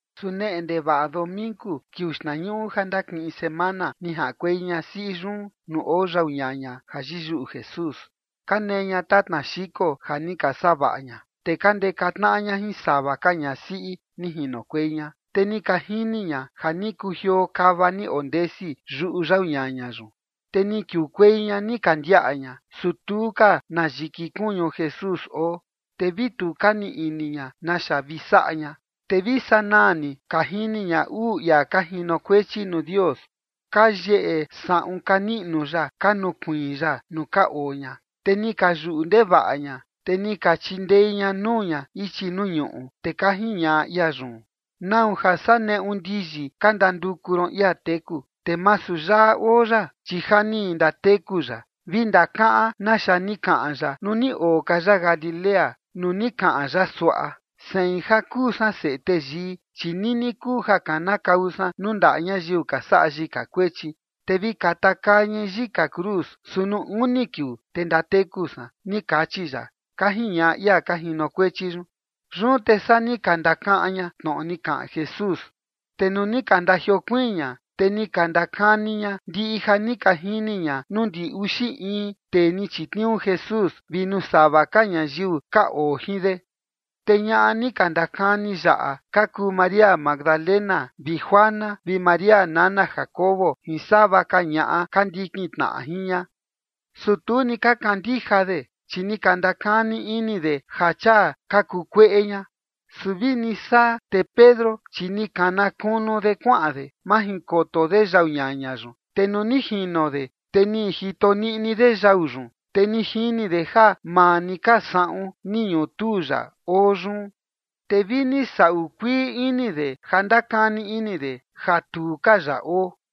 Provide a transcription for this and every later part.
Su neꞌe ndevaꞌa domingu, kiuu xtnañuꞌu ja ndakiꞌin semana, ni jaꞌankuei ñasiꞌi yun nuu oo yau ñaña ja yiyuꞌu Jesús. Ka nee ña tatna xiko ja ni ka savaꞌa ña, te ka ndeka tnaꞌa ña jin sava ka ñasiꞌi ni jinokuei ña. Te ni ka jini ña ja ni kujioo kava ni ondesi yuꞌu yau ñaña yun. Te ni kiukuei ña ni ka ndiaꞌa ña, su tu ka na yiki kuñu Jesús oo. Te vi tu ka nii ini ña naxa vi saꞌa ña, te vi sanaa ni ka jini ña uu ia ka jinokuechi nuu Dios, ka yeyeꞌe saꞌun ka niꞌnu ya ka nukuiin ya nuu ka oo ña. Te ni ka yuꞌu ndevaꞌa ña, te ni ka chindei ña nuu ña ichi nuu ñuꞌu. Te ka jiñaꞌa ia yun: ―¿Nau ja saa neꞌu ndiyi ka ndanduku ron ia teku? Te masu yaꞌa oo ya, chi ja ni ndateku ya. Vi ndakaꞌan naxa ni kaꞌan ya nuu ni oo ka ya Galilea, nuu ni kaꞌan ya suaꞌa: “Sein ja kuu san Seꞌe Teyii, chi nini kuu ja kanakau san nuu ndaꞌa ñayiu ka saꞌa yika kuechi, te vi katakaa ñai yika cruz, su nuu uni kiuu te ndateku san”, ni kachi ya ―ka jiñaꞌa ia ka jinokuechi yun. Yun te saa ni ka ndakaꞌan ña tnoꞌo ni kaꞌan Jesús. Te nuu ni ka ndajiokuiin ña, te ni ka ndakani ña ndiꞌi ja ni ka jini ña nuu ndi uxi in tee ni chitniuu Jesús, vi nuu sava ka ñayiu ka oo jin de. Te ñaꞌa ni ka ndakani yaꞌa ka kuu María Magdalena, vi Juana, vi María nana Jacobo, jin sava ka ñaꞌa ka ndikin tnaꞌa jin ña. Su tu ni ka kandija de, chi ni ka ndakani ini de ja chia ka kuu kueꞌe ña. Su vini saa, te Pedro, chi ni kana kunu de kuaꞌan de, majinkoto de yau ñaña yun. Te nuu ni jino de, te ni jito niꞌni de yau yun, te ni jini de ja maa ni ka saꞌun ni ñutuu ya oo yun. Te vi ni saꞌu kuii ini de ja ndakani ini de ja tu ka ya oo.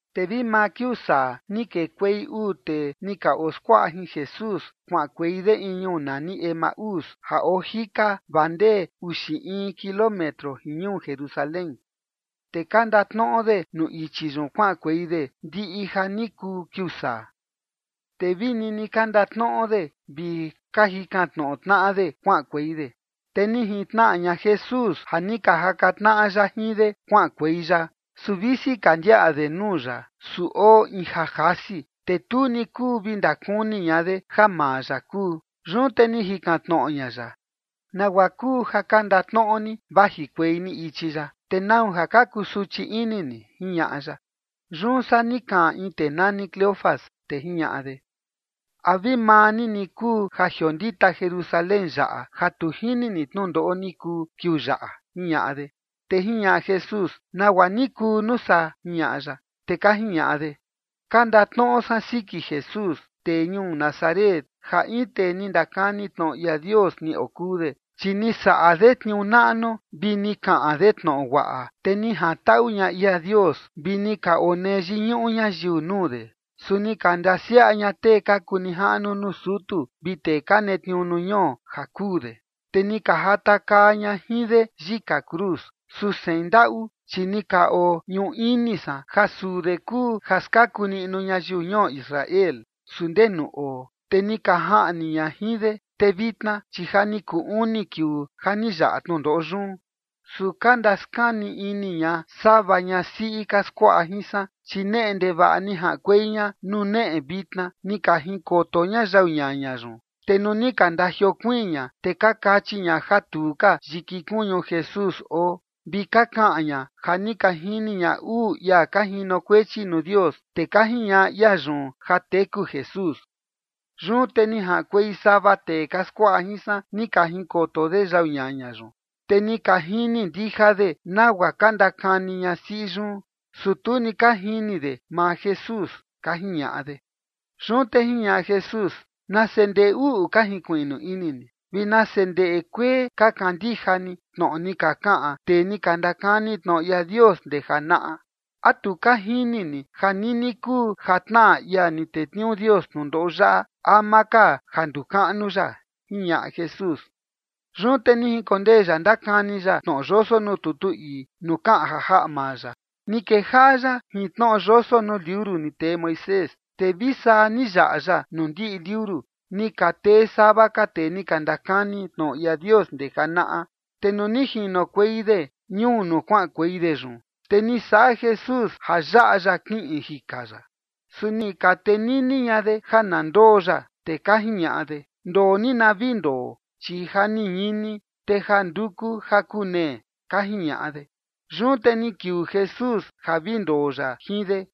Te vi maa kiuu saa ni kekuei uu tee ni ka oskuaꞌa jin Jesús, kuaꞌankuei de in ñuu nani Emaús ja oo jika vaa ndee uxi in kilómetro jin ñuu Jerusalén. Te ka ndatnoꞌo de nuu ichi yun kuaꞌankuei de ndiꞌi ja ni kuu kiuu saa. Te vi nini ka ndatnoꞌo de vi ka jikan tnoꞌo tnaꞌa de kuaꞌankuei de, te ni jintnaꞌa ña Jesús ja ni ka jaka tnaꞌa ya jin de kuaꞌankuei ya. Su visi ka ndiaꞌa de nuu ya, su oo in ja jasi, te tu ni kuu vi ndakuni ña de ja maa ya kuu. Yun te ni jikan tnoꞌo ña ya: ―¿Nagua kuu ja ka ndatnoꞌo ni vajikuei ni ichi yaꞌa? ¿Te nau ja ka kusuchi ini ni? ―jiñaꞌa ya. Yun saa ni kaꞌan in tee nani Cleofas, te jiñaꞌa de: ―¿A vi maa ni ni kuu ja jiondita Jerusalén yaꞌa ja tu jini ni tnundoꞌo ni kuu kiuu yaꞌa? ―jiñaꞌa de. Te jiñaꞌa Jesús: ―¿Te nagua ni kuu, nuu saa? ―jiñaꞌa ya. Te ka jiñaꞌa de: ―Ka ndatnoꞌo san siki Jesús, tee ñuu Nazaret, ja in tee ni ndakani tnoꞌo ia Dios ni okuu de. Chi ni saꞌa de tniuu naꞌnu vi ni kaꞌan de tnoꞌo guaꞌa, te ni jantaꞌu ña ia Dios, vi ni ka onee yiñuꞌu ñayiu nuu de. Su ni ka ndasiaꞌa ña tee ka kuu nijaꞌnu nuu sutu vi tee ka netniuu nuu ñuo ja kuu de, te ni ka jatakaa ña jin de yika cruz. Su sein ndaꞌu, chi ni ka oñuꞌu ini san ja suu de kuu ja skaku niꞌnu ñayiu ñuo Israel. Su ndee nuu oo, te ni ka jaꞌni ña jin de, te vitna, chi ja ni kuu uni kiuu ja ni yaꞌa tnundoꞌo yun. Su ka ndaskani ini ña sava ñasiꞌi ka skuaꞌa jin san, chi neꞌe ndevaꞌa ni jaꞌankuei ña nuu neꞌe vitna, ni ka jinkoto ña yau ñaña yun. Te nuu ni ka ndajiokuiin ña, te ka kachi ña ja tu ka yiki kuñu Jesús oo. Vi ka kaꞌan ña ja ni ka jini ña uu ia ka jinokuechi nuu Dios, te ka jiñaꞌa ia yun ja teku Jesús. Yun te ni jaꞌankuei sava tee ka skuaꞌa jin san, ni ka jinkoto de yau ñaña yun, te ni ka jini ndija de nagua ka ndakani ñasiꞌi yun. Su tu ni ka jini de maa Jesús ―ka jiñaꞌa de. Yun te jiñaꞌa Jesús: ―¡Nase ndeꞌe uꞌu ka jinkuiꞌnu ini ni! Vi ¡nase ndeꞌe kuee ka kandija ni tnoꞌo ni ka kaꞌan tee ni ka ndakani tnoꞌo ia Dios ndee janaꞌa! ¿A tu ka jini ni ja nini kuu ja tnaꞌa ia ni tetniuu Dios tnundoꞌo yaꞌa ama ka ja nduu kaꞌnu ya? ―jiñaꞌa Jesús. Yun te ni jinkondee ya ndakani ya tnoꞌo yoso nuu tutu ii nuu kaꞌan ja jaꞌa maa ya. Ni kejaꞌa ya jin tnoꞌo yoso nuu liuru ni tee Moisés, te vi saa ni yaꞌa ya nuu ndiꞌi liuru ni ka tee sava ka tee ni ka ndakani tnoꞌo ia Dios ndee janaꞌa. Te nuu ni jinokuei de ñuu nuu kuaꞌankuei de yun, te ni saꞌa Jesús ja yaꞌa ya kiꞌin jika ya. Su ni ka tenini ña de ja na ndoo ya, te ka jiñaꞌa de: ―Ndoo ni na vi ndoo, chi ja ni ñini, te ja nduku ja kunee ―ka jiñaꞌa de. Yun te ni kiuu Jesús ja vi ndoo ya jin de.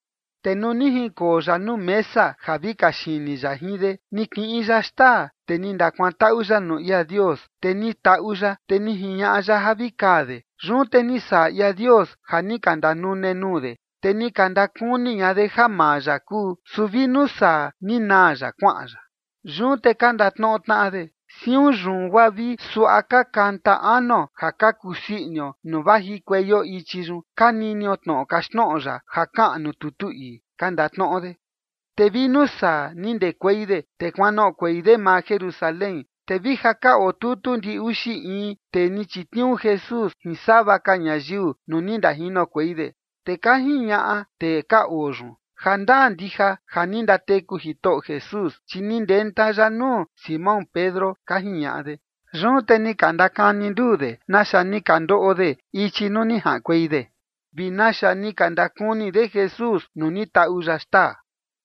Te nuu ni jinkoo ya nuu mesa ja vi kaxini ya jin de, ni kiꞌin ya xtaa, te ni ndakuantaꞌu ya nuu ia Dios, te ni taꞌu ya, te ni jiñaꞌa ya ja vi kaa de. Yun te ni saꞌa ia Dios ja ni ka ndanune nuu de, te ni ka ndakuni ña de ja maa ya kuu. Su vi nuu saa ni naa ya kuaꞌan ya. Yun te ka ndatnoꞌo tnaꞌa de: ―Siun yun guaa vi suaꞌa ka kanta anuo ja ka kusii inio nuu vajikueio ichi yun ka ninio tnoꞌo kaxtnoꞌo ya ja kaꞌan nuu tutu ii ―ka ndatnoꞌo de. Te vi nuu saa, ni ndekuei de, te kuanoꞌokuei de maa Jerusalén. Te vi ja ka oo tutu ndi uxi in tee ni chitniuu Jesús jin sava ka ñayiu nuu ni ndajinokuei de. Te ka jiñaꞌa tee ka oo yun: ―Ja ndaa ndija ja ni ndateku Jitoꞌo Jesús, chi ni ndenta ya nuu Simón Pedro ―ka jiñaꞌa de. Yun te ni ka ndakani nduu de naxa ni ka ndoꞌo de ichi nuu ni jaꞌankuei de, vi naxa ni ka ndakuni de Jesús nuu ni taꞌu ya xtaa.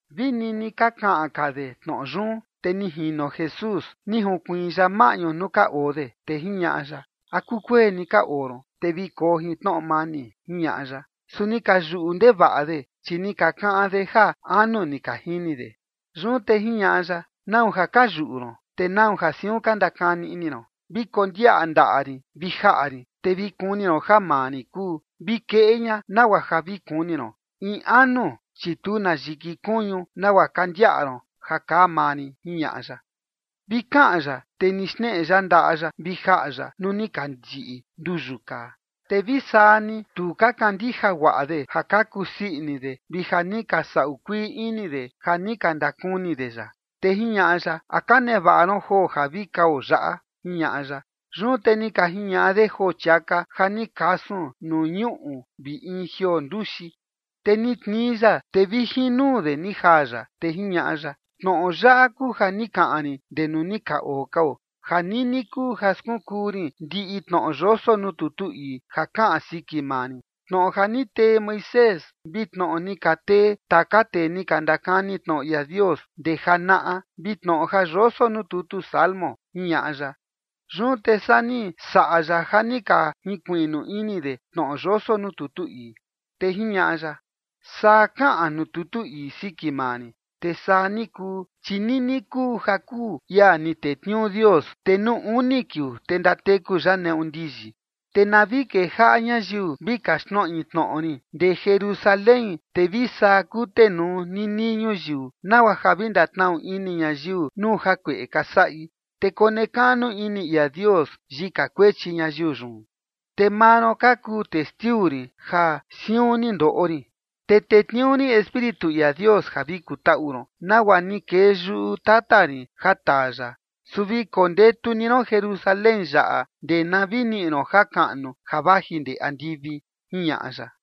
Vi nini ka kaꞌan ka de tnoꞌo yun, te ni jino Jesús, ni junkuiin ya maꞌñu nuu ka oo de. Te jiñaꞌa ya: ―¿A kukueni ka oo ron? Te vi koo jin tnoꞌo mani ―jiñaꞌa ya. Su ni ka yuꞌu ndevaꞌa de, chi ni ka kaꞌan de ja anu ni ka jini de. Yun te jiñaꞌa ya: ―¿Nau ja ka yuꞌu ron? ¿Te nau ja siun ka ndakani ini ron? Vi kondiaꞌa ndaꞌa rin vi jaꞌa rin, te vi kuni ron ja maa rin kuu. Vi keꞌe ña nagua ja vi kuni ron. In anu, chi tu na yiki kuñu nagua ka ndiaꞌa ron ja kaa maa rin ―jiñaꞌa ya. Vi kaꞌan ya, te ni xneꞌe ya ndaꞌa ya vi jaꞌa ya nuu ni ka yiꞌi nduyu kaa. Te vi saa ni tu ka kandija guaꞌa de ja ka kusii ini de vi ja ni ka saꞌu kuii ini de ja ni ka ndakuni de ya. Te jiñaꞌa ya: ―¿A ka nevaꞌa ron joo ja vi kao yaꞌa? ―jiñaꞌa ya. Yun te ni ka jiñaꞌa de joo chiaka ja ni kasun nuu ñuꞌu vi in jioo nduxi. Te ni tnii ya, te vi jin nuu de ni jaa ya. Te jiñaꞌa ya: ―Tnoꞌo yaꞌa kuu ja ni kaꞌan rin ndee nuu ni ka oo kao, ja nini kuu ja skunkuu rin ndiꞌi tnoꞌo yoso nuu tutu ii ja kaꞌan siki maa rin, tnoꞌo ja ni tee Moisés, vi tnoꞌo ni ka tee taka tee ni ka ndakani tnoꞌo ia Dios ndee janaꞌa, vi tnoꞌo ja yoso nuu tutu Salmo ―jiñaꞌa ya. Yun te saa ni saꞌa ya ja ni ka jinkuiꞌnu ini de tnoꞌo yoso nuu tutu ii. Te jiñaꞌa ya: ―Saa kaꞌan nuu tutu ii siki maa rin, te saa ni kuu, chi nini kuu ja kuu ia ni tetniuu Dios, te nuu uni kiuu te ndateku ya neꞌu ndiyi. Te na vi kejaꞌa ñayiu vi kaxtnoꞌi tnoꞌo rin ndee Jerusalén, te vi saa kutenuu ninii ñuyiu, nagua ja vi ndatnaꞌu ini ñayiu nuu jakueꞌe ka saꞌi, te konekaꞌnu ini ia Dios yika kuechi ñayiu yun. Te maa ron ka kuu testiu rin ja siun ni ndoꞌo rin. Te tetniuu rin Espíritu ia Dios ja vi kutaꞌu ron, nagua ni kee yuꞌu tata rin ja taa ya. Su vi kondetu ni ron Jerusalén yaꞌa ndee na vi niꞌi ron jakaꞌnu ja vaji ndee andivi ―jiñaꞌa ya.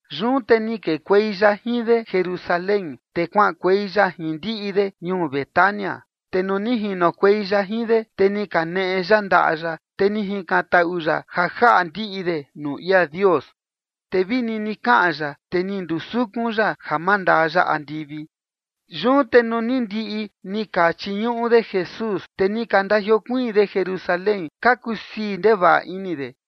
Yun te ni kekuei ya jin de Jerusalén, te kuaꞌankuei ya jin ndiꞌi de ñuu Betania. Te nuu ni jinokuei ya jin de, te ni kaneꞌe ya ndaꞌa ya, te ni jikantaꞌu ya ja jaꞌa ndiꞌi de nuu ia Dios. Te vi nini kaꞌan ya, te ni ndusukun ya ja mandaa ya andivi. Yun te nuu ni ndiꞌi ni ka chiñuꞌu de Jesús, te ni ka ndajiokuiin de Jerusalén, ka kusii ndevaꞌa ini de.